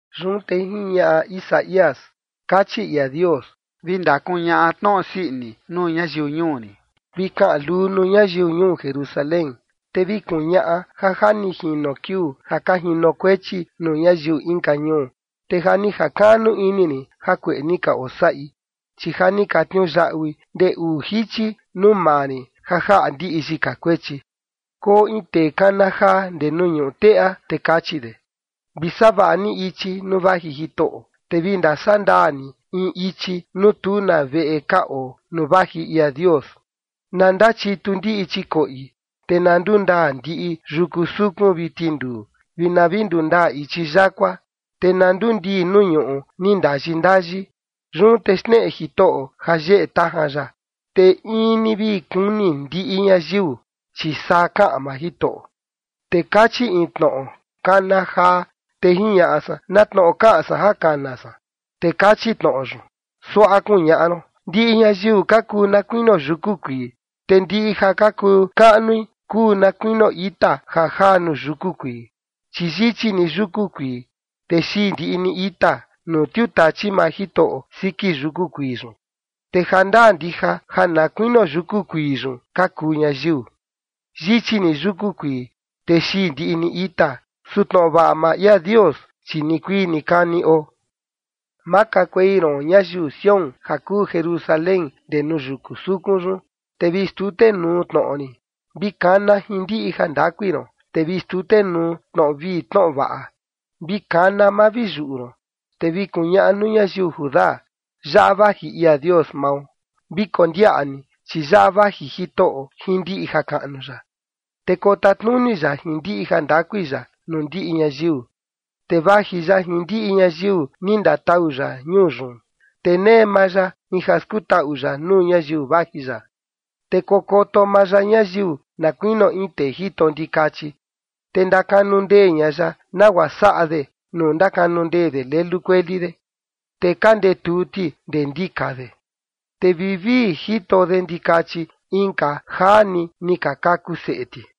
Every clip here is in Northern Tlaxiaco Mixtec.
Yun te jiñaꞌa Isaías: Kachi ia Dios: Vi ndakuñaꞌa tnoꞌo sii ini nuu ñayiu ñuu rin. Vi kaꞌan luu nuu ñayiu ñuu Jerusalén, te vi kuñaꞌa ja ja ni jino kiuu ja ka jinokuechi nuu ñayiu inka ñuu, te ja ni jakaꞌnu ini rin jakueꞌe ni ka osaꞌi, chi ja ni ka tniuyaꞌui ndee uu jichi nuu maa rin ja jaꞌa ndiꞌi yika kuechi. Koo in tee kana jaa ndee nuu ñuꞌu teꞌa, te kachi de: Vi savaꞌa ni ichi nuu vaji Jitoꞌo, te vi ndasaꞌa ndaa ni in ichi nuu tu na veꞌe ka oo, nuu vaji ia Dios. Na ndachitu ndiꞌi chikoꞌi, te na ndundaa ndiꞌi yuku sukun vi tinduu, vi na ndundaa ichi yakua, te na ndundii nuu ñuꞌu ni ndayi ndayi. Yun te xneꞌe Jitoꞌo ja yeꞌe tajan ya, te in ni vi kuni ndiꞌi ñayiu, chi saa kaꞌan maa Jitoꞌo. Te kachi in tnoꞌo: “Kana jaa”. Te jiñaꞌa san: “¿Na tnoꞌo kaꞌan san ja kana san?” Te kachi tnoꞌo yun: “Suaꞌa kuñaꞌa ron: Ndiꞌi ñayiu ka kuu na kuinio yuku kuii, te ndiꞌi ja kuu kaꞌnui kuu na kuinio ita ja jaa nuu yuku kuii. Chi yichi ni yuku kuii, te xii ndiꞌi ni ita, nuu tiutachi maa Jitoꞌo siki yuku kuii yun. Te jandaa ndija ja na kuinio yuku kuii yun ka kuu ñayiu. Yichi ni yuku kuii, te xii ndiꞌi ni ita, su tnoꞌo vaꞌa maa ia Dios, chi nikuii nikani oo”. Makakuei ron ñayiu Sión, ja kuu Jerusalén ndee nuu yuku sukun yun, te vi xtutenuu tnoꞌo rin. Vi kana jin ndiꞌi jandakui ron, te vi xtutenuu tnoꞌo vii tnoꞌo vaꞌa, vi kana, ma vi yuꞌu ron, te vi kuñaꞌa nuu ñayiu Judá: “Yaꞌa vaji ia Dios mao”. Vi kondiaꞌa ni, chi yaꞌa vaji Jitoꞌo jin ndiꞌi jakaꞌnu ya, te kotatnuni ya jin ndiꞌi jandakui ya nuu ndiꞌi ñayiu, te vaji ya jin ndiꞌi ñayiu ni ndatau ya ñuu yun, te nee maa ya in ja skutaꞌu ya nuu ñayiu vaji ya. Te kokoto maa ya ñayiu na kuinio in tee jito ndikachi, te ndakanu ndee ña ya, nagua saꞌa de nuu ndakanu ndee de lelu kueli de, te ka ndetuu ti ndee ndika de, te vivii jito de ndikachi inka jaa ni ni ka kaku seꞌe ti.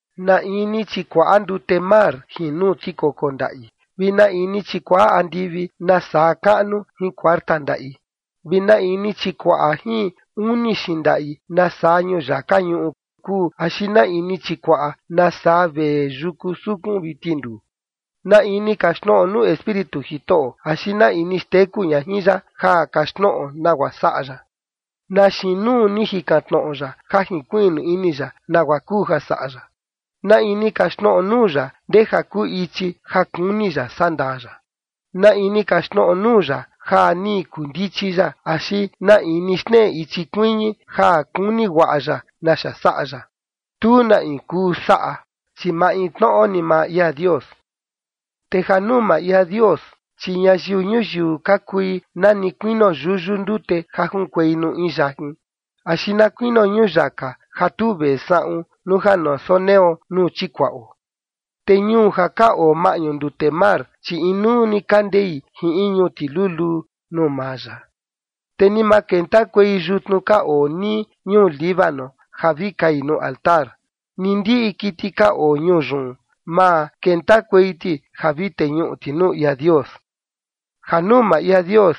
¿Na in ni chikuaꞌa ndute mar jin nuu tikoko ndaꞌi? ¿Vi na in ni chikuaꞌa andivi nasaa kaꞌnu jin kuarta ndaꞌi? ¿Vi na in ni chikuaꞌa jin uni xindaꞌi nasaa ñuyaka ñuꞌu kuu, axi na in ni chikuaꞌa nasaa vee yuku sukun vi tinduu? ¿Na in ni kaxtnoꞌo nuu Espíritu Jitoꞌo, axi na in ni xteku ña jin ya ja kaxtnoꞌo nagua saꞌa ya? ¿Na xiin nuu ni jikan tnoꞌo ya ja jinkuiꞌnu ini ya nagua kuu ja saꞌa ya? ¿Na in ni kaxtnoꞌo nuu ya ndeja kuu ichi ja kuni ya sandaa ya? ¿Na in ni kaxtnoꞌo nuu ya ja ni kundichi ya, axi na in ni xneꞌe ichi kuiñi ja kuni guaꞌa ya naxa saꞌa ya? Tu na in kuu saꞌa, chi maintnoꞌo ni maa ia Dios. Te ja nuu maa ia Dios, chi ñayiu ñuyiu ka kui na ni kuinio yuyu ndute ja junkuei nuu in yajin axi na kuinio ñuyaka ja tu vee saꞌun nuu ja na soneo nuu chikuaꞌo. Te ñuu ja ka oo maꞌñu ndute mar, chi inuu ni ka ndei jin in ñuti luluu nuu maa ya. Te ni ma kentakuei yutnu ka oo nii ñuu Líbano ja vi kai nuu altar, ni ndiꞌi kiti ka oo ñuu yun, ma kentakuei ti ja vi teñuꞌu ti nuu ia Dios. Ja nuu maa ia Dios,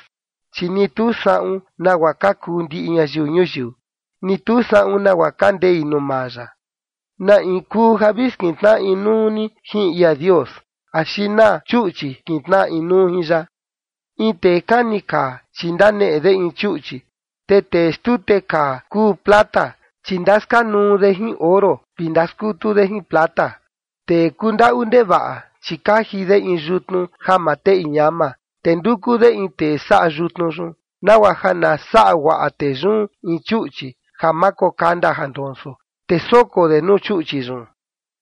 chi ni tu saꞌun nagua ka kuu ndiꞌi ñayiu ñuyiu, ni tu saꞌun nagua ka ndei nuu maa ya. ¿Na in kuu ja vi skintnaꞌa inuu ni jin ia Dios, axi na chuꞌchi kintnaꞌa inuu jin ya? In tee kani kaa, chi ndaneꞌe de in chuꞌchi, te tee xtute kaa kuu plata, chi ndaskanuu de jin oro vi ndaskutu de jin plata. Tee kundaꞌu ndevaꞌa, chi kaji de in yutnu ja ma teꞌi ñama, te nduku de in tee saꞌa yutnu yun, nagua ja na saꞌa guaꞌa tee yun in chuꞌchi ja ma kokanda ja ndonso, te soko de nuu chuꞌchi yun.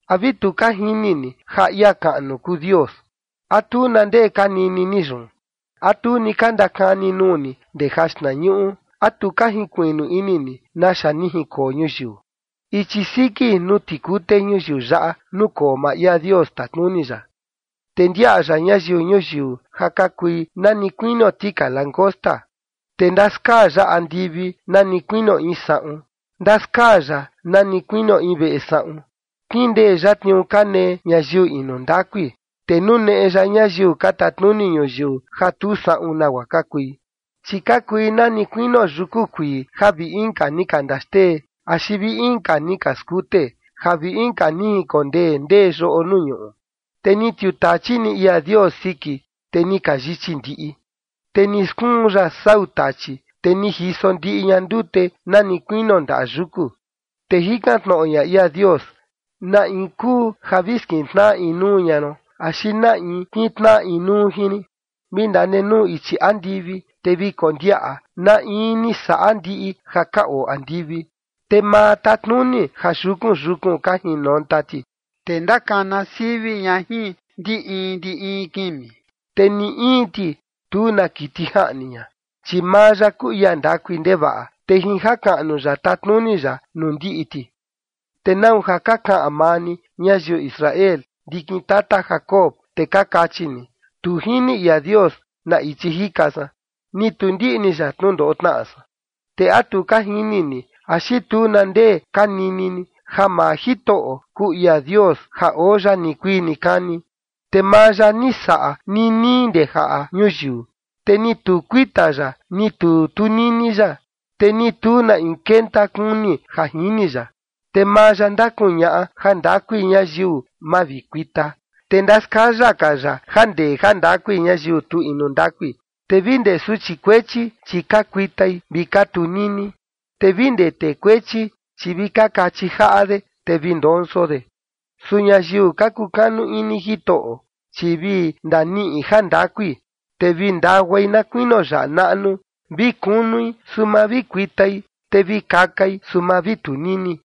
¿A vi tu ka jini ni ja ia kaꞌnu kuu Dios? ¿A tu na ndee ka nini ni yun? ¿A tu ni ka ndakani nuu ni ndee jaxtnañuꞌu? ¿A tu ka jinkuiꞌnu ini ni naxa ni jinkoo ñuyiu? Ichi siki nuu tikute ñuyiu yaꞌa nukoo maa ia Dios tatnuni ya, te ndiaꞌa ya ñayiu ñuyiu ja ka kui na ni kuinio tika langosta, te ndaskaa ya andivi na ni kuinio in saꞌun, ndaskaa ya na ni kuinio in veꞌe saꞌun. Kindee ya tniuu ka nee ñayiu inu ndakui, te nuneꞌe ya ñayiu ka tatnuni ñuyiu ja tu saꞌun nagua ka kui. Chi ka kui nani kuinio yuku kuii ja vi inka ni ka ndaxtee axi vi inka ni ka skute, ja vi inka ni jinkondee ndee yoꞌo nuu ñuꞌu, te ni tiutachi ni ia Dios siki, te ni ka yichi ndiꞌi. Te ni skuun ya sau tachi, te ni jiso ndiꞌi ña ndute na ni kuinio ndaꞌa yuku. Te jikan tnoꞌo ña ia Dios: “¿Na in kuu ja vi skintnaꞌa inuu ña ron, axi na in kintnaꞌa inuu jin rin?” Vi ndanenuu ichi andivi, te vi kondiaꞌa na in ni saꞌa ndiꞌi ja ka oo andivi, te maa tatnuni ja yukun yukun ka jinonta ti, te ndakana sivi ña jin ndi in ndi in kimi, te ni in ti tu na kiti jaꞌni ña. Chi maa ya kuu ia ndakui ndevaꞌa, te jin jakaꞌnu ya tatnuni ya nuu ndiꞌi ti. ¿Te nau ja ka kaꞌan maa ni, ñayiu Israel, ndikin tata Jacob, te ka kachi ni: “Tu jini ia Dios na ichi jika san, ni tu ndiꞌni ya tnundoꞌo tnaꞌa san”? ¿Te a tu ka jini ni axi tu na ndee ka nini ni ja maa Jitoꞌo, kuu ia Dios ja oo ya nikuii nikani? Te maa ya ni saꞌa ninii ndee jaꞌa ñuyiu, te ni tu kuita ya, ni tu tunini ya, te ni tu na in kenta kuni ja jini ya. Te maa ya ndakuñaꞌa jandakui ñayiu ma vi kuita, te ndaskaya ka ya ja ndee ja ndakui ñayiu tu inu ndakui, Te vi ndee suchi kuechi, chi ka kuitai vi ka tunini te vi ndee tee kuechi, chi vi kachi jaꞌa de, te vi ndonso de. Su ñayiu ka kukanu ini Jitoꞌo, chi vi ndaniꞌi jandakui, te vi ndaguai na kuinio yaꞌa naꞌnu, vi kunui, su ma vi kuitai, te vi kakai, su ma vi tunini.